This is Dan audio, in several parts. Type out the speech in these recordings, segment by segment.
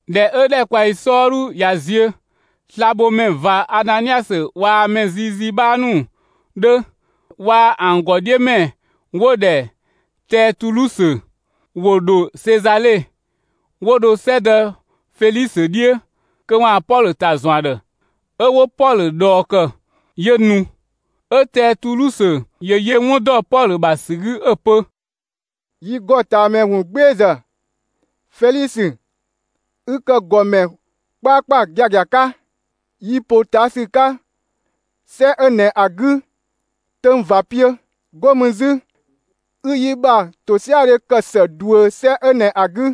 ꞊Dhɛ 'ö ‑dhɛkpaɔyi 'sɔɔdhu ꞊ya ziö, slabhomɛ ꞊va Ananiasö waa‑ mɛ ziizii 'bhaa ‑nu 'dhö waa‑ ‑an ‑gɔ 'dhiö ‑mɛ 'wo‑ ‑dhɛ Tɛɛtulusö, ‑wo ‑dho Sezale, 'wo dho 'sɛdë Felisö 'dhiö kö 'waan‑ Pɔlö ‑ta ‑zɔn ‑a ‑dhë. 'Ö 'wo Pɔlö ꞊dhɔɔ ‑kë, 'yö nu. 'Ö Tɛɛtulusö ‑yö yö 'wun ‑dɔ Pɔlö ‑bha ‑sü 'gü 'ö‑ pö: «Yi ‑gɔtaamɛ ‑wungbeezë, Felisö, ü ‑kë ‑gɔmɛ 'kpaakpa giagia 'ka; yi ‑potaasü 'ka 'sɛ 'ö ꞊nɛ ‑a 'gü 'töng ꞊va 'piö. 'Go mü 'zü, 'ü yi ‑bha ‑tosiadhe ‑kë ‑së ꞊duö 'sɛ 'ö ꞊nɛ ‑a 'gü.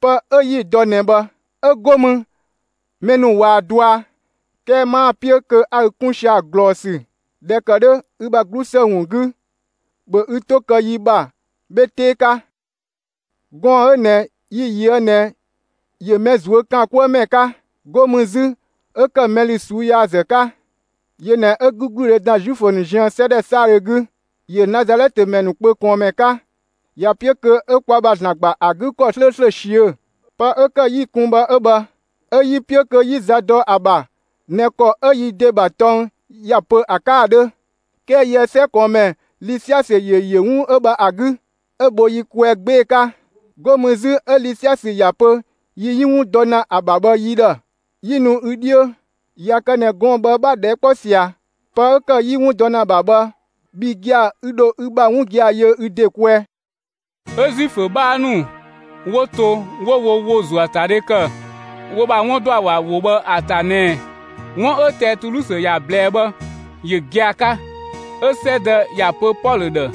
Pë 'ö 'yi‑ dɔ ꞊nɛ bhë, 'ö 'go mü mɛ ‑nu ꞊waa‑ dɔa. 'Kɛɛ 'maa‑ 'piö kö 'a ü 'kun sia‑ ꞊glɔɔsü. ꞊Dhɛ ‑kë 'dhö ü ‑bha 'glusë ‑wun 'gü, ‑bhö ü 'to kë yi ‑bha 'bhe 'tee 'ka! Gɔɔn‑ 'ö ꞊nɛ yi‑ ꞊yöë' ꞊nɛ ‑yö mɛ ꞊zuö' ‑kaan 'kuë ‑mɛ 'ka. 'Go mü 'zü 'ö ‑kë mɛ ‑lü ꞊suu'‑ yaazë 'ka. Yö ꞊nɛ 'ö 'gügludhe ‑da Zuifö ‑nu ziën, 'sɛ ‑dhɛ 'saadhö 'gü. ‑Yö Nazalɛtë ‑mɛ ‑nu kpö ꞊kɔɔnmɛ 'ka. ‑Ya 'piö kö 'ö kwa ‑bha ‑Zlan ‑gba ‑a 'gü ‑kɔ 'slööslö ꞊siö'. Pë 'ö ‑kë 'yi‑ kun bhë 'ö bhë. ['Ö 'yi‑ 'piö kö 'yi za dɔ ‑a ‑bha ꞊nɛ ‑kɔ 'ö yi ‑de ‑bha tɔng ‑ya pö ‑a 'ka ‑a 'dhö. 'Kɛɛ yië‑ 'sɛ ꞊kɔɔnmɛ Lisiasö ‑yö ‑yö 'wun 'ö bhë ‑a 'gü, 'ö‑ bho yi kwɛɛ 'gbee‑ 'ka. 'Go mü 'zü 'ö Lisiasö ‑ya pö yi 'yi 'wun dɔ ‑na ‑a ‑bha bhë yi ‑dhë, 'yi nu ü 'dhiö.] ꞊Ya kë ꞊nɛ gɔɔn‑ bhë 'bha‑ ꞊dhɛɛ' kpɔ ꞊sia, pë 'ö ‑kë 'yi 'wun dɔ ‑na ‑a ‑bha bhë, bhi gia‑ ü ‑dho ü ‑bha 'wun gia‑ yö ü ‑de kwɛɛ.» 'Ö Zuifö 'bhaa ‑nu 'wo to 'wo wo ‑wo ‑zuöatadhe ‑kë, wo ‑bha 'wun ‑dɔ ‑a ‑bha ‑wo bhë ‑a ‑ta ꞊nɛ 'wun 'ö Tɛɛtulusö ‑ya ꞊blɛɛ bhë ‑yö gia‑ 'ka. 'Ö 'sɛdë ‑ya pö Pɔlö ‑dhë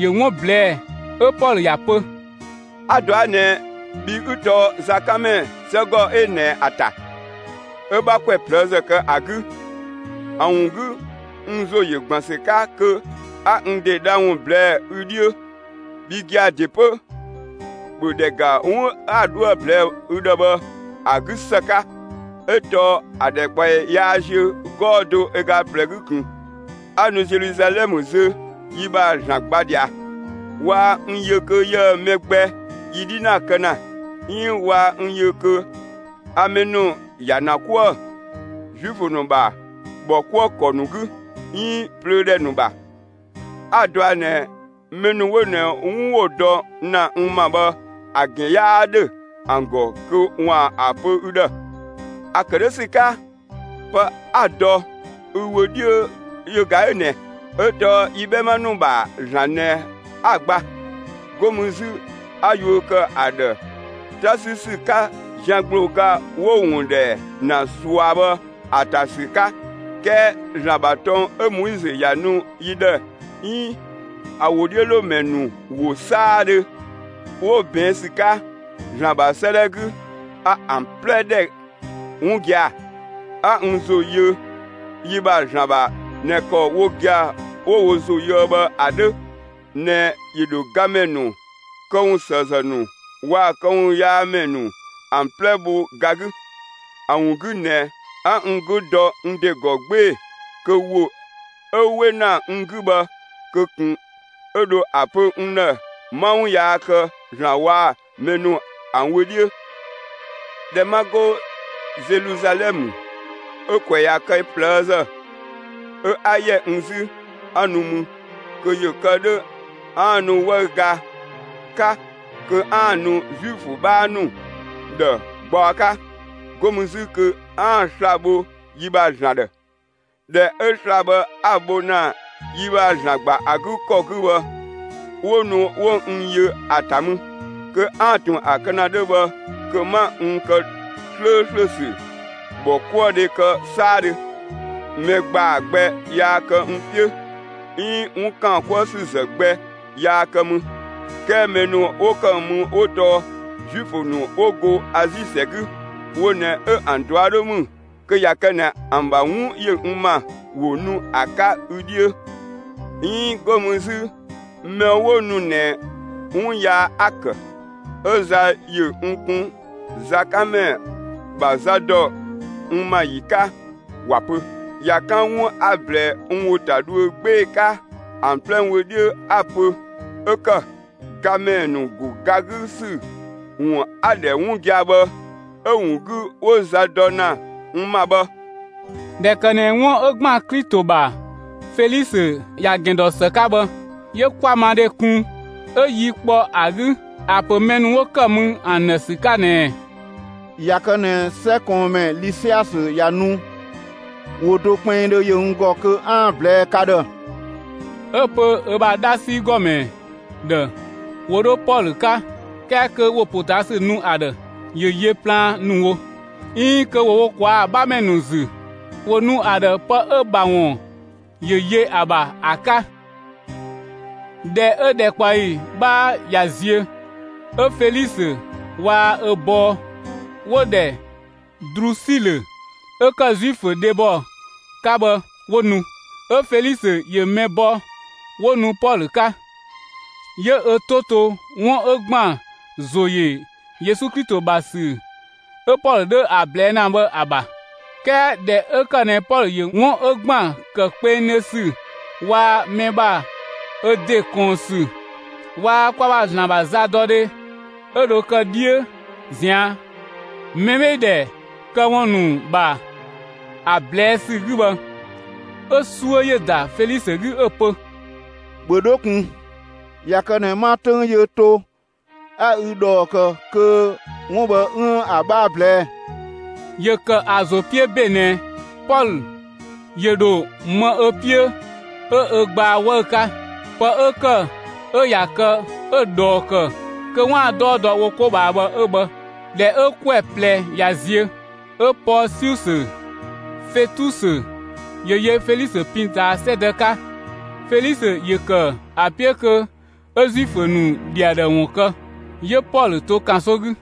‑yö 'wun ꞊blɛɛ'‑, 'ö Pɔlö ‑ya pö: «A‑ ꞊dɔa' ꞊nɛ, bhi 'ü tɔɔ zakanmɛ 'sɛgɔ 'ö ꞊nɛ ‑a ‑ta, 'ö 'bha ‑kwɛ ꞊plëëzë kë ‑a 'gü. ‑A ‑wun 'gü n ‑zo ‑yö ‑gban ‑sü 'ka kö 'a n ‑de dha ‑wun ꞊blɛɛ'‑ ü 'dhiö. Bhi gia‑ ‑de 'pö, ‑bhö ‑dhɛ ‑ga 'wun 'a 'dhoë‑ ꞊blɛɛ'‑ ü ‑dhë bhë ‑a 'gü ‑së 'ka! 'Ö tɔɔ ‑a ‑dhɛkpaɔyi yaa ziö 'gɔɔ‑ do ö ga ꞊plɛ 'gü ꞊kun, 'a nu Zeluzalɛmë zö yi ‑bha ‑Zlan gba ꞊dhia. Waa n yö kö yië‑ mɛ gbɛ yi 'dhinaa kë ‑na, 'iin waa n yö kö a mɛ ‑nu ‑ya ‑na 'kuë‑ Zuifö ‑nu ‑bha ‑bhɔkuëkɔ ‑nu 'gü, 'iin plöö ‑dhɛ ‑nu ‑bha. 'A‑ ꞊dɔa' ꞊nɛ mɛ ‑nu 'wo ꞊nɛ 'wun 'wo‑ dɔ ‑na n ‑ma bhë ‑a ‑gɛn 'yaa ‑dhö ‑an ‑gɔ kö ‑waan ‑a pö ü ‑dhë. ‑A ‑kë 'dhö ‑sü 'ka, pë 'a‑ dɔ ü wö 'dhiö yö ꞊ga 'ö ꞊nɛ: 'Ö tɔɔ yi 'bhɛma ‑nu ‑bha ‑Zlan ꞊nɛ 'a‑ gba, 'go mü 'zü a yuö ‑kë ‑a ‑dhë 'ta 'sü ‑sü 'ka zian ‑gblooga 'wo‑ ‑wun ‑dhɛ ‑na ꞊sua bhë ‑a ‑ta ‑sü 'ka. 'Kɛɛ ‑Zlan ‑bha tɔng 'ö Moizö ‑ya nu yi ‑dhë 'iin ‑a ‑wodhiölomɛ ‑nu ‑wo 'saadhö 'wo ꞊bɛɛn' ‑sü 'ka ‑Zlan ‑bha 'sëëdhɛ 'gü, a ‑an 'plɛ ‑dhɛ 'wun gia‑. A n ‑zo ‑yö yi ‑bha ‑Zlan ‑bha ꞊nɛ ‑kɔ wo gia‑ 'wo wo ‑zo yöë bhë ‑a 'dhö ꞊nɛ ‑yö ‑dho gamɛ ‑nu këwunsëëzë ‑nu waa‑ këwunyaamɛ ‑nu ‑an 'plɛ bho ga 'gü. ‑A ‑wun 'gü ꞊nɛ 'a n 'gü dɔ n ‑de ‑gɔ 'gbee‑ kö ‑wo 'ö 'we ‑na n 'gü bhë kö ꞊kun 'ö dho ‑a pö n ‑dhë 'ma 'wun yaa kë ‑Zlan waa‑ mɛ ‑nu ‑an wö 'dhiö. ꞊Dhɛ 'ma 'go Zeluzalɛmë 'ö‑ ‑kwɛ ꞊ya kë ꞊plëëzë 'ö 'a ‑yɛ n 'zü, 'a nu mü kö ‑yö kë 'dhö 'aan‑ nu 'wëüga 'ka kö 'aan‑ ‑a nu Zuifö 'bhaa ‑nu ‑dhë gbaɔ 'ka, 'go mü 'zü kö 'aan‑ sla‑ bho yi ‑bha ‑Zlan ‑dhë. ꞊Dhɛ 'ö sla‑ bhë 'a‑ bho ‑na yi ‑bha ‑Zlan ‑gba ‑a 'gü ‑kɔ 'gü bhë, 'wo nu 'wo n yö ‑a ‑ta mü. Kö 'aan‑ ꞊tun ‑a kë ‑na 'dhö bhë kö 'ma n ‑kë 'slööslö ‑sü ‑bhɔkuëdhe kë 'saadhö. Mɛ ‑gbaa gbɛ yaa kë n 'piö, 'iin 'wun ‑kaan 'kuë ‑sü ‑zë gbɛ yaa kë mü. 'Kɛɛ mɛ ‑nu 'wo ‑kë mü 'wo tɔɔ Zuifö ‑nu 'wo go Azi ‑sɛ 'gü, wo ꞊nɛ 'ö ‑an ꞊dua' 'dhö ‑mü kö ꞊ya kë ꞊nɛ ‑an ‑bha 'wun ‑yö n ‑ma, ‑wo nu ‑a 'ka ü 'dhiö. 'Iin 'go mü 'zü mɛ 'wo nu ꞊nɛ 'wun yaa 'a‑ ‑kë 'ö za ‑yö n kun zakanmɛ ‑bha za ‑dɔ n ‑ma ‑yi 'ka ‑wa pö. ꞊Ya 'kan 'wun 'a‑ ꞊blɛɛ n ‑wo ‑ta dhuö 'gbee‑ 'ka ‑an 'plɛ wö 'dhiö ‑a ‑bha 'ö ‑kë: ‹Gamɛ ‑nu ‑go ga 'gü ‑sü ‑wun 'a‑ ‑dhɛ 'wun gia‑ bhë, 'ö‑ ‑wun 'gü 'wo za dɔ ‑na n ‑ma bhë!›» ꞊Dhɛ ‑kë ꞊nɛ 'wun 'ö ‑gban Klito ‑bha Felisö ‑ya ‑gɛn dɔ ‑së 'ka bhë, 'yö 'kwamadhe kun, 'ö yi kpɔ ‑a 'gü ‑a ‑pö mɛ ‑nu 'wo ‑kë mü ‑an ‑dhë ‑sü 'ka ꞊nɛɛ: «꞊Ya kë ꞊nɛ 'sɛ ꞊kɔɔnmɛ Lisiasö ꞊ya nu ‑wo do kpinngdhö ‑yö n ‑gɔ kö 'aan‑ ‑a ꞊blɛɛ'‑ ka ‑dhë.» 'Ö‑ pö ö ‑bha 'dhasi ‑gɔmɛ ‑dhë ‑wo 'dho Pɔlö 'ka; 'kɛɛ kö ‑wo ‑potaasü nu ‑a ‑dhë ‑yö yö plaan ‑nu wo, 'iin kö ‑wo wo ꞊kwaa' ‑a 'bhamɛ ‑nu ‑zü, ‑wo nu ‑a ‑dhë pë 'ö‑ ‑bha ‑wun ‑yö yö ‑a ‑bha ‑a 'ka. ꞊Dhɛ 'ö ‑dhɛkpaɔyi 'bhaa ꞊ya ziö, 'ö Felisö waa‑ ö bɔɔ 'wo‑ ‑dhɛ Drusilö 'ö ‑kë Zuifö dhebɔ 'ka bhë 'wo nu. 'Ö Felisö ‑yö mɛ bɔ 'wo nu Pɔlö 'ka. 'Yö ö 'to to 'wun 'ö ‑gban ‑zo ‑yö Yesu Klito ‑bha ‑sü 'ö Pɔlö 'dhö ‑a ꞊blɛɛ' ‑na bhë ‑a ‑bha. 'Kɛɛ ꞊dhɛ 'ö ‑kë ꞊nɛ Pɔlö ‑yö 'wun 'ö ‑gban ‑kë kpengdhö ‑sü waa‑ mɛ ‑bha ö ‑de ꞊kɔɔn ‑sü waa‑ kwa ‑bha ‑Zlan ‑bha zadɔdhe 'ö dho kë 'dhiö ꞊zian', mɛbheedhɛ këwun ‑nu ‑bha ‑a ꞊blɛɛ' ‑sü 'gü bhë, 'ö 'suö ‑yö ‑da Felisö 'gü 'ö‑ pö: «‑Bhö 'dho ꞊kun! ꞊Ya kë ꞊nɛ 'ma 'töng yö to, 'a ü ꞊dhɔɔ ‑kë kö 'wun 'ö bhë 'üën‑ ‑a 'bhaa ꞊blɛɛ.» ‑Yö ‑kë ‑a ‑zo 'piö ‑be ꞊nɛ Pɔlö ‑yö ‑dho më ö 'piö 'ö ö gbaa 'wëü‑ 'ka. Pë 'ö ‑kë 'ö ꞊ya kë 'ö‑ ꞊dhɔɔ ‑kë kö 'waan‑ 'dɔɔ dɔ wo 'ko ꞊bhaa bhë 'ö bhë. ꞊Dhɛ 'ö ‑kwɛ ꞊plɛ ꞊ya ziö, 'ö Pɔɔsiusö Fetusö ‑yö yö Felisö pin ꞊taa 'sɛdë 'ka. Felisö ‑yö ‑kë ‑a 'piö kö 'ö Zuifö ‑nu ‑dhi ‑a ‑dhë ‑wun kë; 'yö Pɔlö to ‑kanso 'gü.